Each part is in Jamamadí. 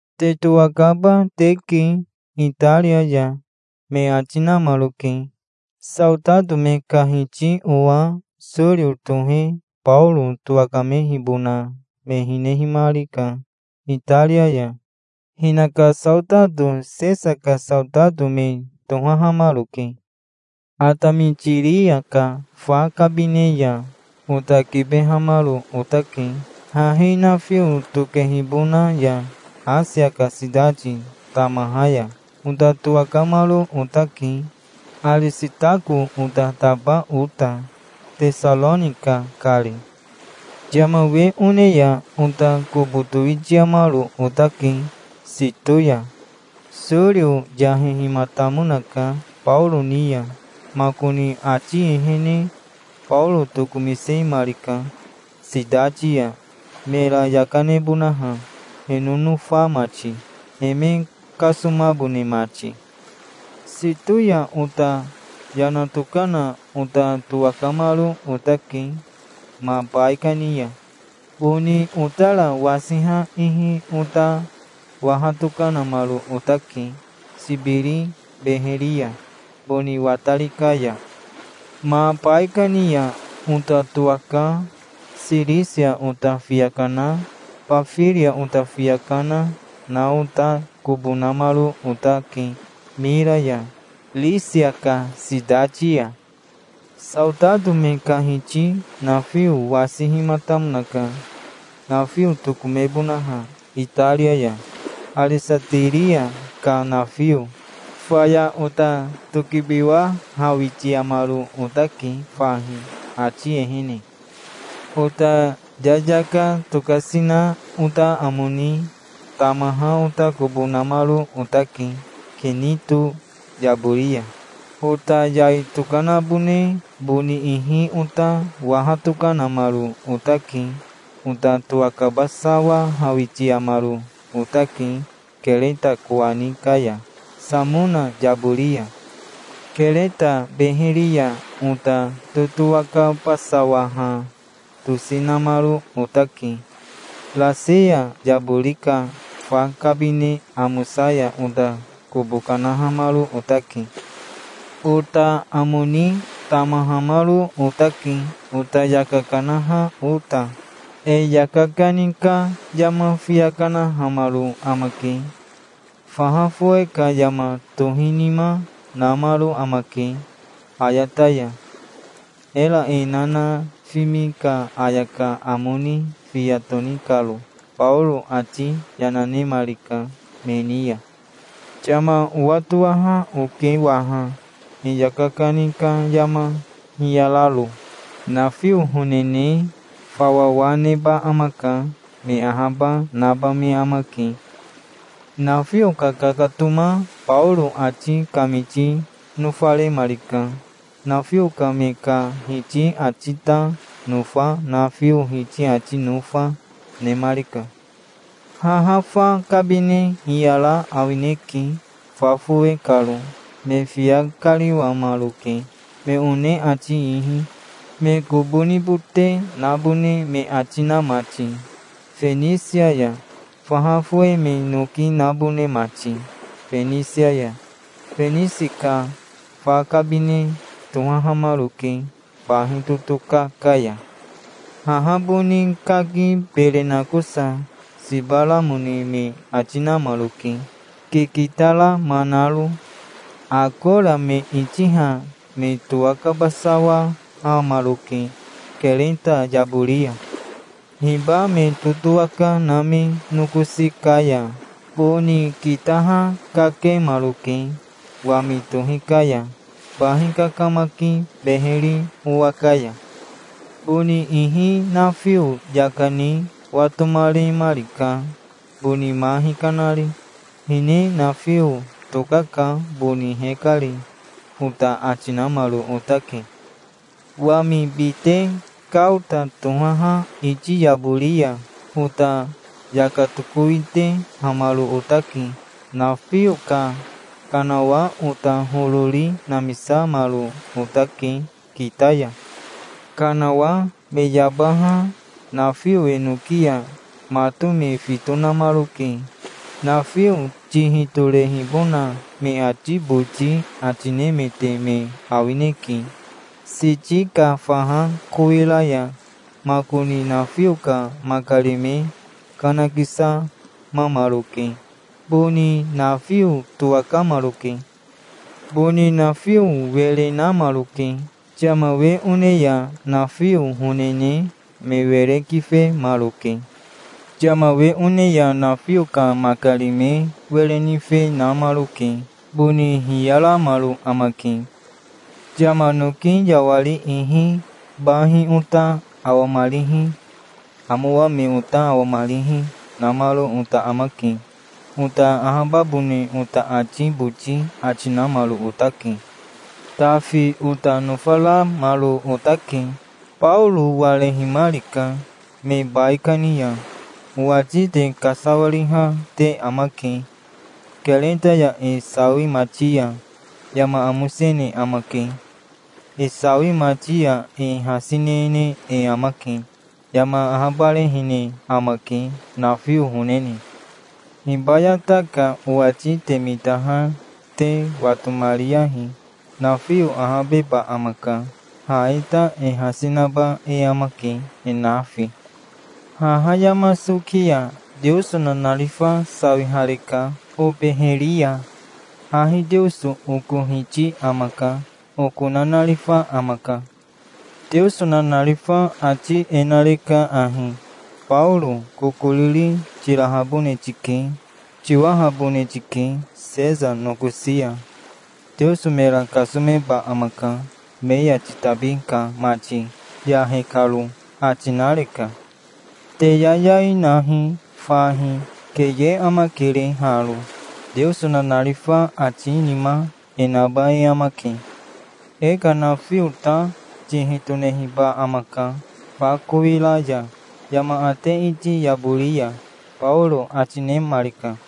"Te towakaba teke Itaria ya", me ati namaroke. Saotato me ka hiti owa Sorio tohe Baoro towakamehibona me hinehimarika Itaria ya. Hinaka saotato Sesa ka saotato me tohahamaroke. Atamitiria ka fa kabine ya ota kibehamaro otake, hahi nafio tokehibona ya Asia ka sitati tamaha ya. Ota towakamaro otake, Arisitako ota taba ota, Tesaronika kari. Yama we one ya ota kobo towitiamaro otake Sito ya. Sorio yahehimatamonaka Baoro ni ya. Makoni ati ehene Baoro tokomisemarika sitati ya mera yaka nebonaha, he nonofa mati, he me kasomabone mati. Sito ya ota yana tokana ota towakamaro otake ma baikani ya. Boni otara wasiha ihi ota waha tokanamaro otake, Sibiri beheri ya, boni watari ka ya. Ma baikani ya ota towaka Sirisia ota fiya kana Bafiria ota fiya kana, na ota kobo namaro otake Mira ya, Risia ka sitati ya. Saotato me ka hiti nafio wasihimatamonaka, nafio tokomebonaha Itaria ya, Aresatiria ka nafio. Faya ota tokibiwahawitiamaro otake fahi ati ehene. Ota yayaka tokasi na ota amo ni tamaha ota kobo namaro otake Kinito yabori ya. Ota yai tokanabone boni ihi ota waha tokanamaro otake. Ota towakabasawahawitiamaro otake Kereta kowani ka ya Samona yabori ya. Kereta beheri ya ota totowakabasawaha tosi namaro otake. Raseya yabori ka Fa Kabine Amosa ya ota kobo kanahamaro otake. Ota amo ni tamahamaro otake, ota yaka kanaha ota. E yaka kani ka yama fiya kanahamaro amake. Faha fowe ka yama tohinima namaro amake ayata ya, era e nanafimi ka ayaka amo ni fiya toni karo. Baoro ati yana nemarika me ni ya. "Yama owatowaha oke waha, e yaka kani ka yama hiyararo. Nafio honene fawawa neba amaka. Me ahaba naba me amake". Nafio kakakatoma Baoro ati kamiti nofaremarika. Nafio ka me ka hiti ati ta nofa, nafio hiti ati nofa, nemarika. Haha fa kabine hiyara awineke fa fowe karo. Me fiya kariwamaroke, me one ati ihi, me kobo nibote nabone me ati na mati Fenisi ya, faha fowe me noki nabone mati Fenisi ya. Fenisi ka fa kabine tohahamaroke bahi totoka ka ya. Haha boni kaki bere nakosa siba ramone me ati namaroke, kikita rama naro. Akora me itiha me towakabasawahamaroke Kereta yabori ya. Hiba me totowaka na me nokosi ka ya boni kitaha kakemaroke wami tohi ka ya, bahi kakamaki beheri owa ka ya. Boni ihi nafio yaka ni watomaremarika, boni ma hikanari. "Hine nafio tokaka boni hekari", ota ati namaro otake. Wami bite Kaota tohaha iti yabori ya ota yaka tokowitehamaro otake. Nafio ka kanawa ota horori namisamaro otake kita ya. Kanawa me yabaha nafio enoki ya mato me fito namaroke. Nafio tihi torehibona me ati boti ati nemete me awineke, Siti ka faha kowira ya. Makoni nafio ka makari me kanakisamamaroke. Boni nafio towakamaroke. Boni nafio were namaroke. Yama we one ya nafio honene me were kifemaroke. Yama we one ya nafio ka makari me were nife, namaroke. Boni hiyaramaro amake. Yama noki yawari ihi bahi ota awamarihi, amowa me ota awamarihi, namaro ota amake. Ota ahababone ota ati boti ati namaro otake. Tafi ota nofaramaro otake. Baoro warehimarika me baikani ya. "Owati te kasawariha te amake. Kereta ya e sawimati ya yama amosene amake. E sawimati ya e hasi nene e amake. Yama ahabarehene amake, nafio honene. Hibayata ka owati te mitaha te watomariyahi. Nafio ahabeba amaka. Ha e ta e hasi naba e amake, e nafi. Haha yama soki ya Teoso nanarifa sawihareka obeheri ya. Hahi Teoso oko Hiti amaka. Oko nanarifa amaka. Teoso nanarifa ati e nareka ahi: 'Baoro kokoriri tirahabone tike. Tiwahabone tike Sesa nokosi ya. Teoso mera kasomeba amaka, me ya titabi ka mati, yahe karo', ati nareka. Te yayai nahi fahi. Keye amakere haro. Teoso nanarifa ati nima e naba e amake. E ka nafio ta tihi tonehiba amaka fa kowira ya yama ate iti yabori ya", Baoro ati nemarika.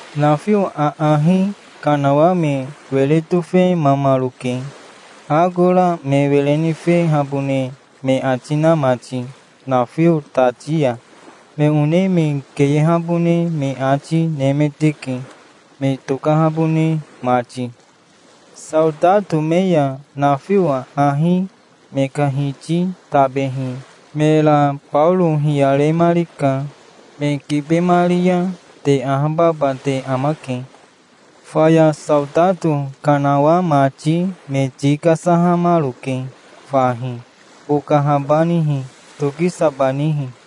Nafio aahi kanawa me were tofemamaroke, akora me were nifehabone me ati na mati nafio tati ya. Me one me keyehabone me ati nemeteke, me tokahabone mati. Saotato me ya nafio aahi me ka hiti tabehi mera Baoro hiyaremarika. "Me kibemari ya te ahababa te amake". Faya saotato kanawa mati me ti kasahamaroke fahi, bokahabanihi, tokisabanihi.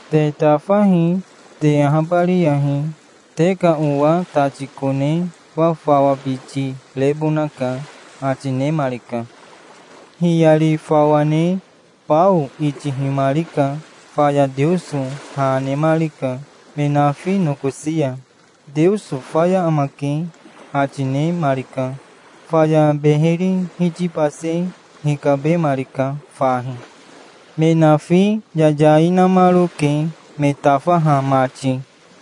Te tafahi, te ahabariyahi. Te ka owa tati kone fafawabiti rebonaka", ati nemarika. Hiyari fawa ne bao itihimarika. Faya Teoso ha nemarika, me nafi nokosi ya. "Teoso faya amake", ati nemarika. Faya beheri hitibase hikabemarika fahi. Me nafi yayai namaroke, me tafaha mati.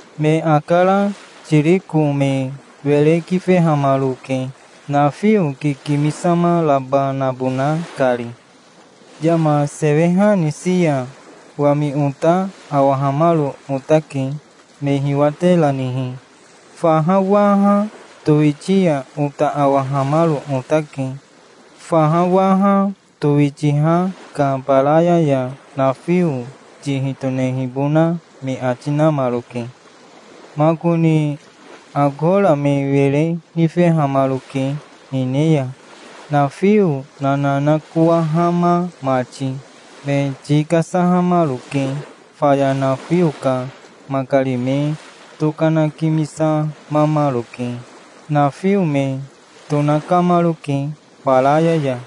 Me akara tiriko me were kifehamaroke, nafio kikimisama raba nabona kari. Yama seweha nisi ya wami ota awahamaro otake, me hiwateranihi. Faha waha towitia ota awahamaro otake. Faha waha towitiaha ka baraya ya nafio tihi tonehibona me ati namaroke. Makoni akora me were nifehamaroke hine ya. Nafio nananakowahama mati me ti kasahamaroke. Faya nafio ka makari me tokanakimisamamaroke. Nafio me tonakamaroke baraya ya.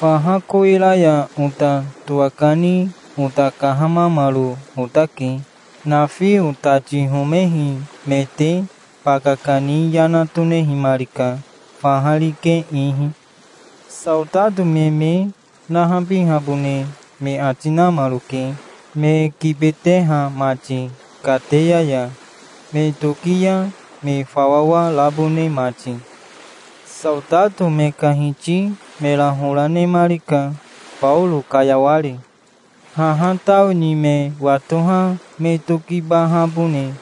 Faha kowira ya ota towakani ota kahamamaro otake. Nafio tati homehi mete baka kani yana tonehimarika, faha rike ihi. Saotato me me nahabihabone me ati namaroke, me kibeteha mati kateya ya, me toki ya me fawawa rabone mati. Saotato me ka hiti mera hora nemarika, Baoro kayawari. Haha tao ni me watoha me tokibahabone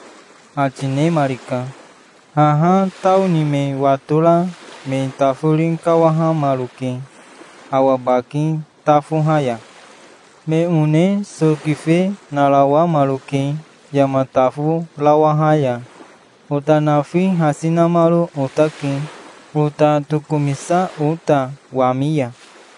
ati nemarika. Haha tao ni me watora me tafori kawahamaroke awa baki tafoha ya. Me one so kife narawamaroke yama taforawaha ya. Ota nafi hasi namaro otake, ota tokomisa ota wami ya.